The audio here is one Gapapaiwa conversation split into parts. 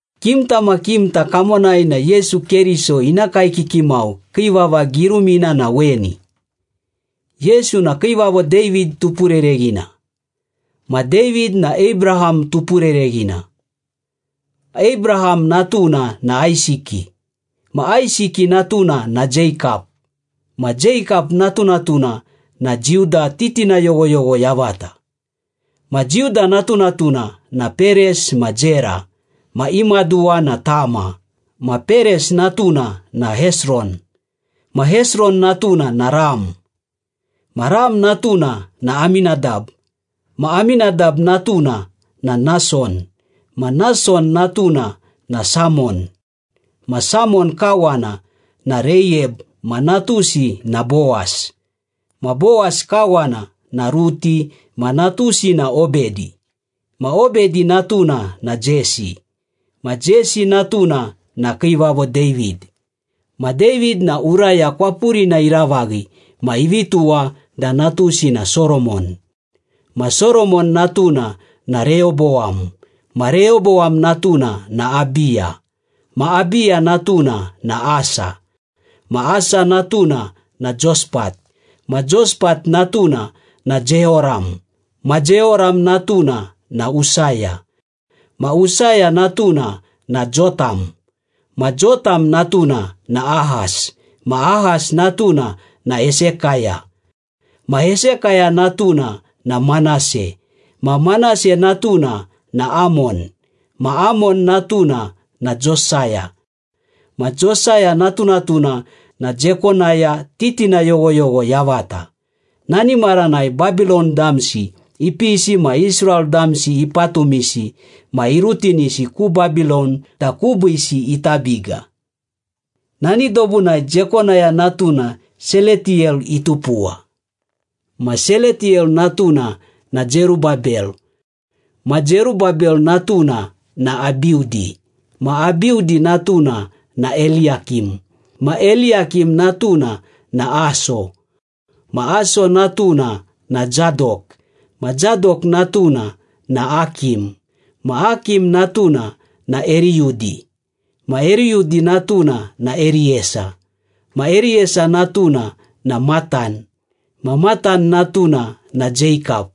Kimta ma kimta kamonai na Yesu Keriso ina kaekiki mau kii vava girumina na weni. Yesu na Kiivavo David tupurereghina, ma David na Abraham tupurereghina. Abraham natuna na Aisiki, ma Aisiki natuna na Jeikap, ma Jeikap natunatuna na Juda titina yoghoyogho yavata, Ma Juda natunatuna na Peres ma Zera, ma i maduwa na Tama, ma Peres natuna na Hesron, ma Hesron natuna na Ram. Ma Ram natuna na Aminadab, ma Aminadab natuna na Nason, ma Nason natuna na Samon, ma Samon kawana na Reiyab ma natusi na Bowas, ma Bowas kawana na Ruti ma natusi na Obedi, ma Obedi natuna na Jesi, ma Jesi natuna na Kiivavo David. Ma David na Uraya kwapurina iravaghi ma ivi tuwa da natusi na Soromon, ma Soromon natuna na Reyobowam, ma Reyobowam natuna na Abiya, ma Abiya natuna na Asa, ma Asa natuna na Jospat, ma Jospat natuna na Jeyoram, ma Jeyoram natuna na Usaya, ma Usaya natuna na Jotam, ma Jotam natuna na Ahas, ma Ahas natuna na Hesekaya, ma Hesekaya natuna na Manase, ma Manase natuna na Amon, ma Amon natuna na Josaya, ma Josaya natunatuna na Jekonaya titina yoghoyogho yavata. Nani maranai Babilon damsi ipisi ma Israel damsi ipatumisi ma irutinisi ku Babilon da kubiisi ita biga. Nani dobunai Jekonaya natuna Seletiyel itupuwa, ma Seletiyel natuna na Zerubabel, ma Zerubabel natuna na Abiudi, ma Abiudi natuna na Eliyakim, ma Eliyakim natuna na Aso, ma Aso natuna na Zadok, ma Zadok natuna na Akim, ma Akim natuna na Eriyudi, ma Eriyudi natuna na Eriyesa, ma Eriyesa natuna na Matan, ma Matan natuna na Jeikap,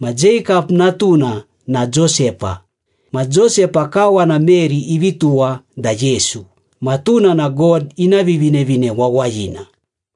ma Jeikap natuna na Josepa. Ma Josepa kawana Meri ivi tuwa da Yesu, ma tuna na God ina Vivinevine Wawayina.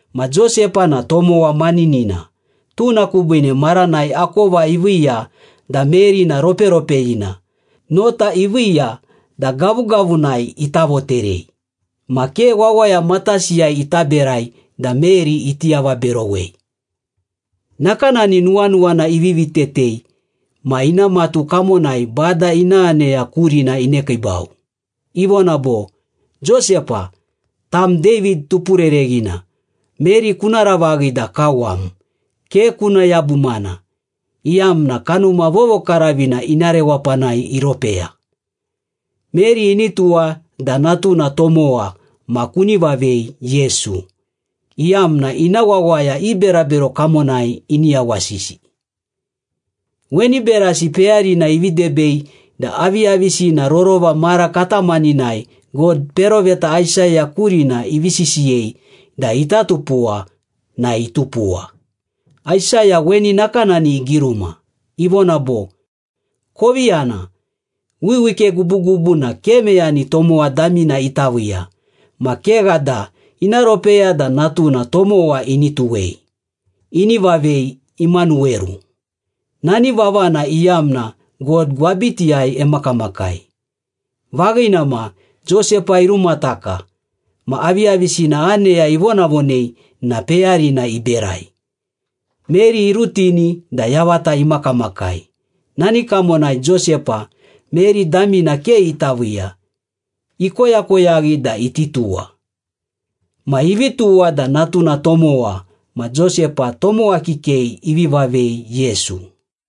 Ma Josepa na tomowa maninina, tuna kubiine maranai akova iviiya da Meri na roperopeyina, nota iviiya da gavugavunai ita voterei. Ma ke wawaya matasiyai ita berai da Meri iti avaberowei. Nakanani nuwanuwana ivivi tetei ma ina matu kamonai Bada ina aneya kurina inekiibau. Ivona bo, “Josepa, tam David tupurereghina, Meri kuna ravaghi da kawam. Ke kuna yabumana, iyamna Kanuma Vovokaravina ina rewapanai iropeya. Meri ini tuwa da natuna tomowa ma kuni vavei Yesu, iyamna ina wawaya i berabero kamonai ini yawasisi.” Weni berasi peyarina ivi debei da aviyavisina rorova mara katamaninai God peroveta Aisaya kurina ivi sisiyei da ita tupuwa na itupuwa. Aisaya weni nakanani igiruma, ivona bo, “Kovi yana, wiwike gubugubu na ke meyani tomowa damina ita viiya, ma kegha da ina ropeya da natuna tomowa ini tuwei. Ini vavei Imanuweru.” Nani vavana iyamna, “God gwabitiyai emakamakai.” Vaghina ma, Josepa irumataka ma aviyavisina aneya ivonavonei na peyarina iberai. Meri irutini da yavata imakamakai. Nani kamonai Josepa, Meri damina ke ita viiya, ikoyakoyaghi da iti tuwa. Ma ivi tuwa da natuna tomowa ma Josepa tomowa kikei ivi vavei Yesu.